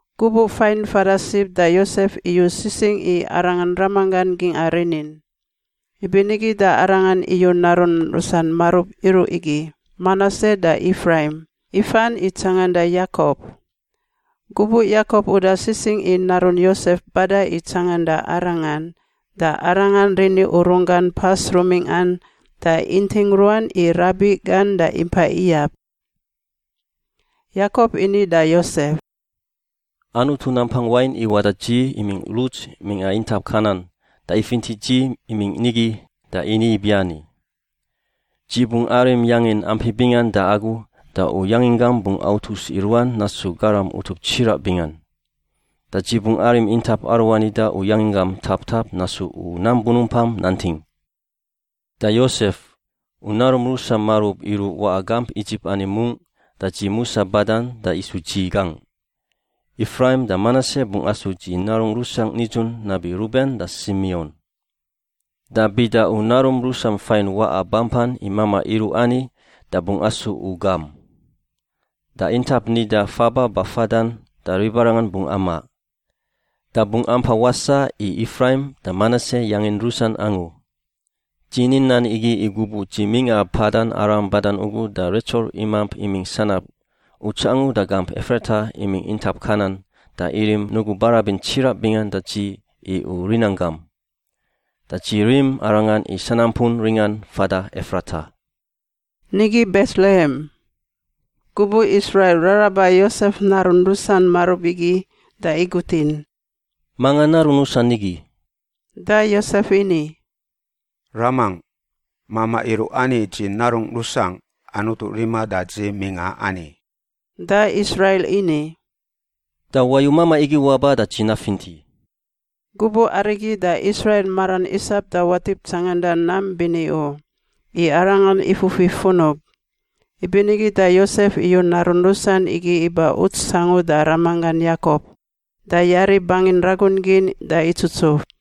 Gubuꞌ fain fada sib da Yosef iyu sisingꞌ i arangan ramanggan gingꞌa rinin. Ibinigi da arangan iyu narun rusan marub iruꞌ igi, Manase da Ifraim, ifan i tsanganda Yakop. Gubuꞌ Yakop uda sisingꞌ i narun Yosef bada i tsanganda arangan, da arangan rini urun gan pas rumingꞌan da inting ruan i rabiꞌ gan da impa iyab. Yakop ini da Yosef, “Anutu Nampang Wain iwaꞌ da dzi imingꞌ Luts mingꞌa intap Kanan da ifinti dzi imingꞌ nigi da ini ibiani, ‘Dzi bungꞌ arim yangin ampi bingan da agu da u yanginggam bungꞌ autus i ruan nasu garam utup tsiraꞌ bingan. Da dzi bungꞌ arim intap aruani da u yanginggam taptap nasu i nam bunumpan nanting.’ Da, Yosef, u narum rusam marub iruꞌ waꞌa gamp Idzip ani mungꞌ da dzi musa badan da isu dzi gangꞌ; Ifraim da Manase bungꞌ asu dzi narungꞌ rusangꞌ nidzun nabi Ruben da Simion. Da bida u narum rusam fain waꞌa bampan i mamaꞌ iruꞌ ani da bungꞌ asu u gam. Da intap nida faba bafadan da ribarangan bungꞌ amaꞌ. Da bungꞌ ampa wasaꞌ i Ifraim da Manase yangin rusan angu. Dzi ni nan igi i gubuꞌ dzi mingꞌa Padan Aram badan ugu da Retsel imamp imingꞌ sanab, uts angu da gamp Efrata imingꞌ intap Kanan da irim nugu barabin tsiraꞌ bingan da dzi i u rinanggam. Da dzi rim arangan i sanampun ringan fada Efrata” (nigi Betlehem). Gubuꞌ Israil raraba Yosef narun rusan marub igi da igutin, “Manga narun rusan igi?” Da Yosef ini, “Ramangꞌ! Mamaꞌ iruꞌ ani dzi narungꞌ rusangꞌ Anutu riman da dzi mingꞌa ani.” Da Israil ini, “Da wayu mamaꞌ igi waba da dzi nafinti.” Gubuꞌ arigi da Israil maran isap da watip tsanganda nam bini u, i arangan ifufi funub. Ibinigi da Yosef iyu narun rusan igi iba uts angu da ramanggan Yakop, da yari bangin ragun gin da itsutsuf.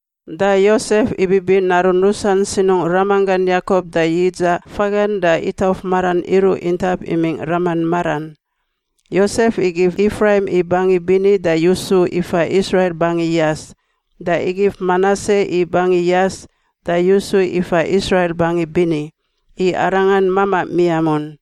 Da Yosef ibibi narun rusan sinungꞌ ramanggan Yakop da yidzaꞌ fagan da itauf maran iruꞌ intap imingꞌ raman maran. Yosef igif Ifraim i bangi bini da yusu ifa Israil bangi yas da igif Manase i bangi yas da yusu ifa Israil bangi bini, i arangan mamaꞌ miamun.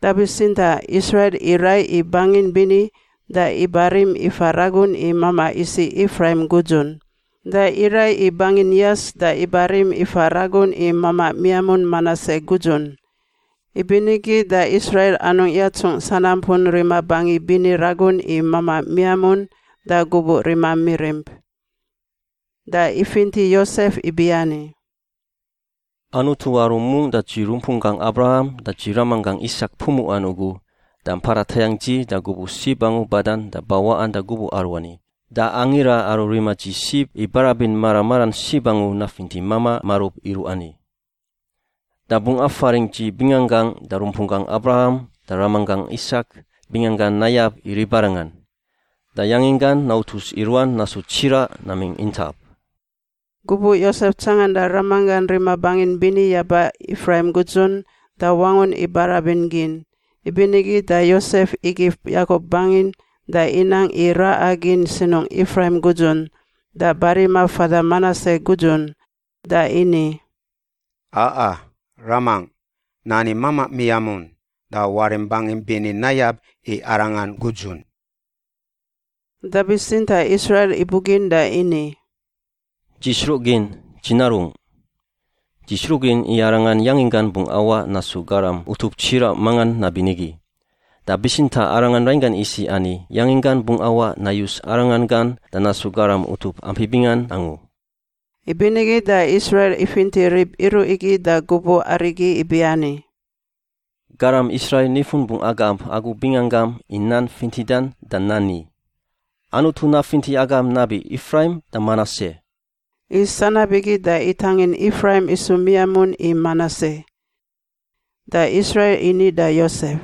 Da bitsintaꞌ Israil iraiꞌ i bangin bini da ibarim ifa ragun i mamaꞌ isiꞌ Ifraim gudzun. Da iraiꞌ i bangin yas da ibarim ifa ragun i mamaꞌ miamun Manase gudzun. Ibinigi da Israil anungꞌ yatsungꞌ sanampun rima bangi bini ragun i mamaꞌ miamun da gubuꞌ rima mirimp. Da ifinti Yosef ibiani, “Anutu aru mungꞌ da dzi rumpunggangꞌ Abraham da dzi ramanggangꞌ Isak pumuꞌan ugu da mpada tayangꞌ dzi da gubuꞌ sib angu badan da bawaꞌan da gubuꞌ aruani, da Angira aru rima dzi sib i barabin mara maran sib angu nafinti mamaꞌ marub iruꞌ ani. Da bungꞌ afaringꞌ dzi binganggangꞌ da rumpunggangꞌ Abraham da ramanggangꞌ Isak binganggan nayab i ribarangan, da yanginggan nautus i ruan nasu tsiraꞌ namingꞌ intap.” Gubuꞌ Yosef tsanganda ramanggan rima bangin bini yaba Ifraim gudzun, da wangun i barabin gin, ibinigi da Yosef igif Yakop bangin da inang i raꞌa gin sinungꞌ Ifraim gudzun da barima fada Manase gudzun. Da ini, “A̛a ramangꞌ! Nani mamaꞌ miamun. Da warim bangim bini nayab i arangan gudzun.” Da bitsintaꞌ Israil ibugin da ini, “Dzi sruꞌgin, dzi narungꞌ! Dzi sruꞌgin i arangan yanginggan bungꞌ awaꞌ nasu garam utup tsiraꞌ mangan nabinigi. Da bitsintaꞌ arangan rainggan isiꞌ ani yanginggan bungꞌ awaꞌ nayus arangan gan da nasu garam utup ampi bingan angu.” Ibinigi da Israil ifinti rib iruꞌ igi da gubuꞌ arigi ibiani, “Garam Israil nifun bungꞌ agamp agu binganggam i nan fintidan da nani, ‘Anutu nafinti agam nabi Ifraim da Manase.’” I sanab igi da itangin Ifraim isu miamun i Manase. Da Israil ini da Yosef,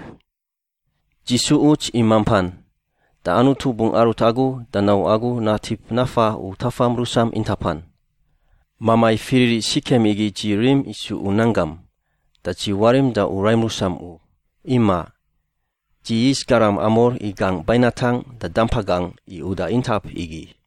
“Dzi su uts i mampan, da Anutu bungꞌ arut agu da nau agu natip nafa u tafam rusam intapan. Mamai fiririꞌ Sikem igi dzi rim isu u nanggam, da dzi warim da u raim rusam u. Imaꞌ. Dzi yis garam Amor i gangꞌ bainatangꞌ da dampa gangꞌ i uda intap igi.”